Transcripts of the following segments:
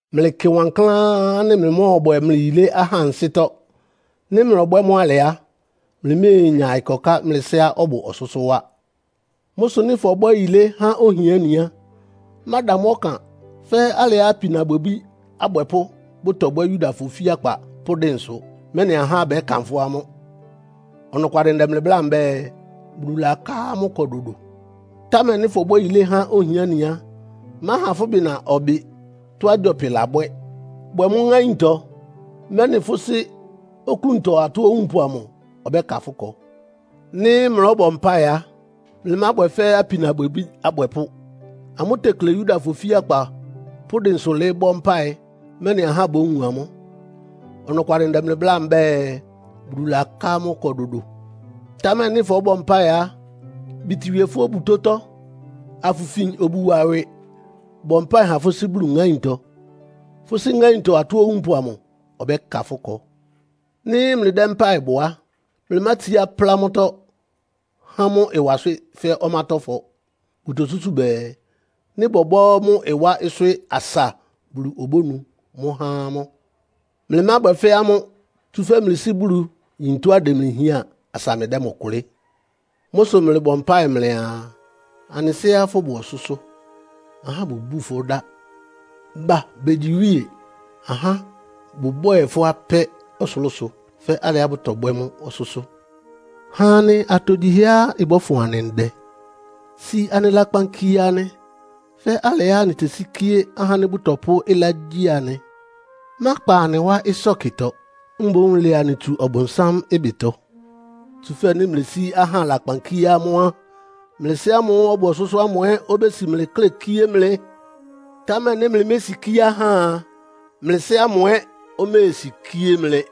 “Mlɩkɩ wankláán ánɩ́ mlɩmɔ́ɔbwɛ mlɩ yilé ahá ansɩ́tɔ́. Nɩ́ mlɔbwɛ́ mʋ́ alɩ á, mlɩméenya ɩkɔká mlɩ Sɩ́á ɔbʋ ɔsʋ́sʋ́ wá. “Mʋ́ sʋ nɩ́ fɔbwɛ́ yilé há ohiáni á, máda mʋ́ ɔkan fɛ́ alɩá apinabwɛbí abwɛpʋ́ bʋtɔbwɛ́ Yudafɔ ofíakpa pʋ́ dɩnsʋ, mɛ́nɩ ahá bɛ́kanfʋ́ amʋ́. Ɔnɔkwalɩ ndɛ mlɩ bláa mbɛ́ɛ, Bulu laká amʋ́ ɩkɔ dodo. Támɛ nɩ́ fɔbwɛ́ yilé há ohiáni á, máha fʋ́ bɩna ɔbɩ tɔ́á gyɔpɩ labwɛ́. Bwɛ mʋ́ ŋáintɔ, mɛ́nɩ fʋ́ Sɩ́ oklúntɔ atɔ́ owúnpʋ amʋ ɔbɛ́ka fʋ́ ɩkɔ. “Nɩ́ mlɔ́bɔ mpáɩ á, mlɩmábwɛ fɛ́ apinabwɛbí abwɛpʋ́. Amʋ́ tekle Yudafɔ ofíakpa pʋ́ dɩnsʋ lɩɩ́ bɔ́ mpáɩ, mɛ́nɩ ahá bówun amʋ́. Ɔnɔkwalɩ ndɛ mlɩ bláa mbɛ́ɛ, Bulu laká amʋ́ ɩkɔ dodo. Támɛ nɩ́ fɔ́bɔ mpáɩ á, bítíwíé fʋ́ obutótɔ́, afʋfin obu wa ɩwɩ, bɔ mpáɩ ha fʋ́ Sɩ́ ŋáintɔ. Fʋ́ Sɩ́ ŋáintɔ atɔ́ owúnpʋ amʋ ɔbɛ́ka fʋ́ ɩkɔ. “Nɩ́ mlɩdɛ́ mpáɩ bɔ á, mlɩmátsiá plá mʋ́tɔ́ há mʋ́ ɩwa swɩ́ fɛ́ ɔmátɔ́fɔ. Bʋtosúsu bɛɛ, nɩ́ bɔbɔ́ mʋ́ ɩwá swɩ́ asa Bulu obónu mʋ́ há amʋ́. Mlɩmábwɛ fɛ́ amʋ́, tsúfɛ́ mlɩ Sɩ́ Bulu yín tɔ́á ɩdɛ mlɩ hián asa mlɩdɛ́ mʋ kʋlɩ́. Mʋ́ sʋ mlɩbɔ mpáɩ mlɩaa, ‘Anɩ Sɩ́á fʋ́bʋ ɔsʋ́sʋ́. Ahá bʋbúu fʋ́ dá. Ba begyi iwíe. Ahá bʋbwɛ́ɛ fʋ́ apɛ́ ɔsʋlʋ́sʋ, fɛ́ alɩá bʋtɔbwɛ́ mʋ́ ɔsʋ́sʋ́. Ha anɩ atogyihɛá ɩbɔ́fʋn anɩ ndɛ. Si anɩ lakpan kie anɩ, fɛ́ alɩá anɩtesíkíé ahá ánɩ́ bʋtɔpʋ́ ɩlá gyi anɩ. Mákpa anɩ wá ɩsɔ́kɩtɔ, mboún lɛ anɩ tsu Ɔbʋnsám ɩbɩtɔ.’ “Tsúfɛ́ nɩ́ mlesí ahá lakpan kíé amʋ́ á, mlɩ Sɩ́ ámʋ́ʋ́ ɔbʋ ɔsʋ́sʋ́ ámʋ ɛ́ obési mlɩ klɛ́ kíé mlɩ. Támɛ nɩ́ mlɩmésikíé ahá a, mlɩ Sɩ́ ámʋ ɛ́ oméesikíé mlɩ.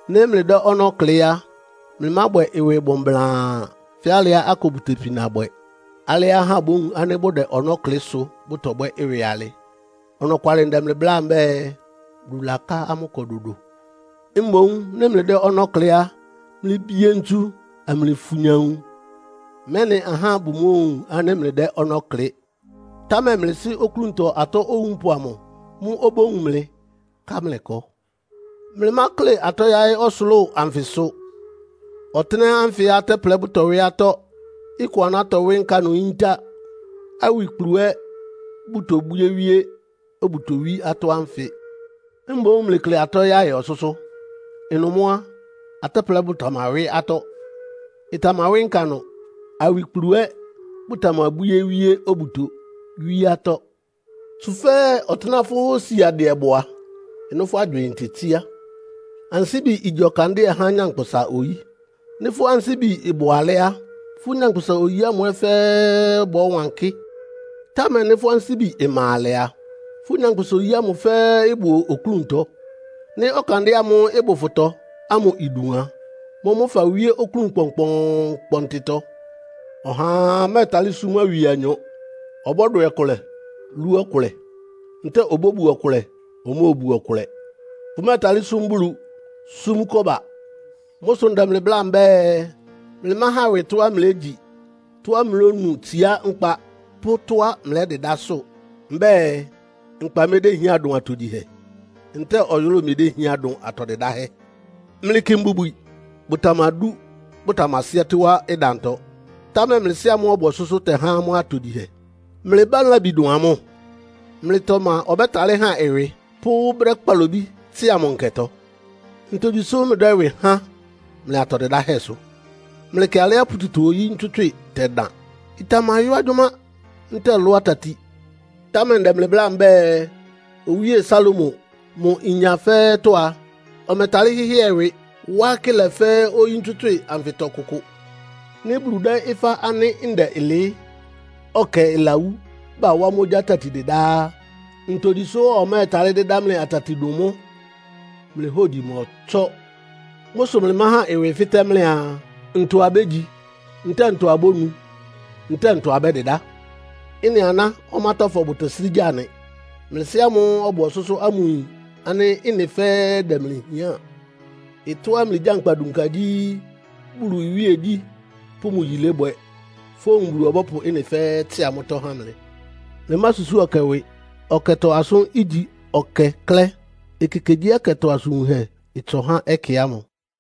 “Nɩ́ mlɩdɛ́ ɔnɔ́ klɩ́ á, mlɩmábwɛ mlɩ ɩwɩ bʋ́mbláán fɛ́ alɩá akʋ bʋtepina bwɛ́. Alɩá ahá bówun ánɩ́ bʋdɛ ɔnɔ́ klɩ sʋ́ bʋtɔbwɛ́ ɩwɩ alɩ. Ɔnɔkwalɩ ndɛ mlɩ bláa mbɛ́ɛ, Bulu laká amʋ́ ɩkɔ dodo. Mboún nɩ́ mlɩdɛ́ ɔnɔ́ klɩ́ á, mlɩbie ntsu, amlɩfunya nwun, mɛ́nɩ ahá bʋmóowun ánɩ́ mlɩdɛ́ ɔnɔ́ klɩ́. Támɛ mlɩ Sɩ́ oklúntɔ atɔ́ owúnpʋ amʋ mʋ́ obówun mlɩ, ká mlɩ ɩkɔ. “Mlɩmákle atɔ́ yáɩ́ ɔsʋlʋ́ʋ anfɩsʋ. Ɔtɩ́nɛ́ ánfɩ atɛ́plɛ bʋtɔwɩ́ atɔ́, ɩkʋ aná tɔwɩ́ nkanʋ yíntá, awikplu ɛ́ bʋtobwíé wíé obuto wí atɔ́ ánfɩ. Mboún mlɩkle atɔ́ yáɩ́ ɔsʋ́sʋ́. Ɩnʋ mʋ́ á, atɛ́plɛ bʋtamawɩ́ atɔ́, ɩtamawɩ́ nkanʋ, awikplu ɛ́ bʋtamabwíé wíé obuto wí atɔ́. Tsúfɛ́ ɔtɩ́nɛ́á fʋ́ siadɩɛ bʋ a, ɩnʋ́ fʋ́ agywɩɩn tetsíá. “Ansíbi igyi ɔkandɩ́ɛ há nyankpʋsa-oyí. Nɩ́ fʋ́ ansíbi bʋ alɛ́ á, fʋ́ nyankpʋsa-oyí ámʋ fɛ́ɛ́ bɔ́wankɩ́. Támɛ nɩ́ fʋ́ ansíbi ma alɛ a, fʋ́ nyankpʋsa-oyí ámʋ fɛ́ɛ́ ɩbʋ oklúntɔ. Nɩ́ ɔkandɩ́ɛ ámʋ́ʋ́ ɩbʋ fʋtɔ ámʋ idun a, mʋ́mʋ́ fawíé oklún kpɔnkpɔɔnkpɔntɩtɔ. “Ɔhaa mɛ́ɛtalɩ́ súm awie anyɔ. Ɔbɔ́dwɛ ɔkʋlɛ, lú ɔkʋlɛ. Ntɛ́ɛ obóbu ɔkʋlɛ, omóobu ɔkʋlɛ. Fʋmɛ́ɛtalɩ́ súm Bulu, súm kɔ́ba. “Mʋ́ sʋ ndɛ mlɩ bláa mbɛ́ɛ, mlɩmáhan ɩwɩ tɔ́á mlégyi, tɔ́á mlónu tsiá nkpa pʋ́ tɔ́á mlɛ́dɩdá sʋ. Mbɛ́ɛ, nkpa medéhián dʋn atogyihɛ? Ntɛ́ɛ ɔyʋlʋ́ʋ medéhián dʋn atɔ dɩdáhɛ́? Mlɩkɩ mbubwi, bʋtamadú, bʋtamasɩ́ɛ́tɩ́ wá ɩdantɔ, támɛ mlɩ Sɩ́á ɔbʋ ɔsʋ́sʋ́ tɛhá amʋ́ atogyihɛ. Mlɩmá labi dʋn amʋ́? Mlɩtɔ ma ɔbɛ́talɩ́ han ɩwɩ pʋ́ brɛ́ kpalobí tsɩ́a mʋ nkɛtɔ? “Ntogyi sʋ́ mlɩdɛ́ ɩwɩ háan mlɩ atɔ dɩdáhɛ́ sʋ? Mlɩkɩ alɩá pututɔ-oyí ntswɩ́tswɩ tɛdan. Ɩtamayɔ́ agyʋ́má ntɛ́ɛ lʋ́ atati. Támɛ ndɛ mlɩ bláa mbɛ́ɛ, Owíe Salomo, mʋ inya fɛ́ɛ́tɔ́ a, ɔmɛtalɩ́ hɩ́hɩɛ ɩwɩ, wá akɩ́lɛ fɛ́ oyí ntswɩ́tswɩ anfɩtɔ kʋkʋ. Nɩ́ Bulu dɛ́ ɩfá ánɩ́ ndɛ ɩlɩɩ́, ɔkɛ ɩlawú, bawá mʋ́ ogyá tati dɩdá á, ntogyi sʋ́ ɔmɛ́ɛtalɩ́ dɩ́dá mlɩ atati dʋn mʋ́? Mlɩ hógyi mɔtsɔ́! “Mʋ́ sʋ mlɩmáhan ɩwɩ fɩ́tɛ́ mlɩaa, ‘Ntɔ abégyi?’ ntɛ́ɛ ‘Ntɔ abónu?’ ntɛ́ɛ ‘Ntɔ abɛ́dɩdá?’ Ɩ́nɩ aná ɔmátɔ́fɔ bʋtɛsrɩ́ gya nɩ. Mlɩ Sɩ́ ámʋ́ʋ́ ɔbʋ ɔsʋ́sʋ́ ámʋ yin ánɩ́ ɩ́nɩ fɛ́ɛ́ dɛ mlɩ hián. Ɩtɔ́á mlɩgyánkpa dunka gyí, Bulu iwíegyí pʋ́ mʋ yilébwɛ, fówun Bulu ɔbɔ́pʋ ɩ́nɩ fɛ́ɛ́ tsɩ́a mʋ́tɔ́ há mlɩ. Mlɩmásusúu ɔkɛ ɩwɩ. Ɔkɛtɔ asʋ́n igyi ɔkɛ klɛ́. Ekekegyíɛkɛtɔ asʋn wunhɛ ɩtsɔ há ɛkɛ ámʋ.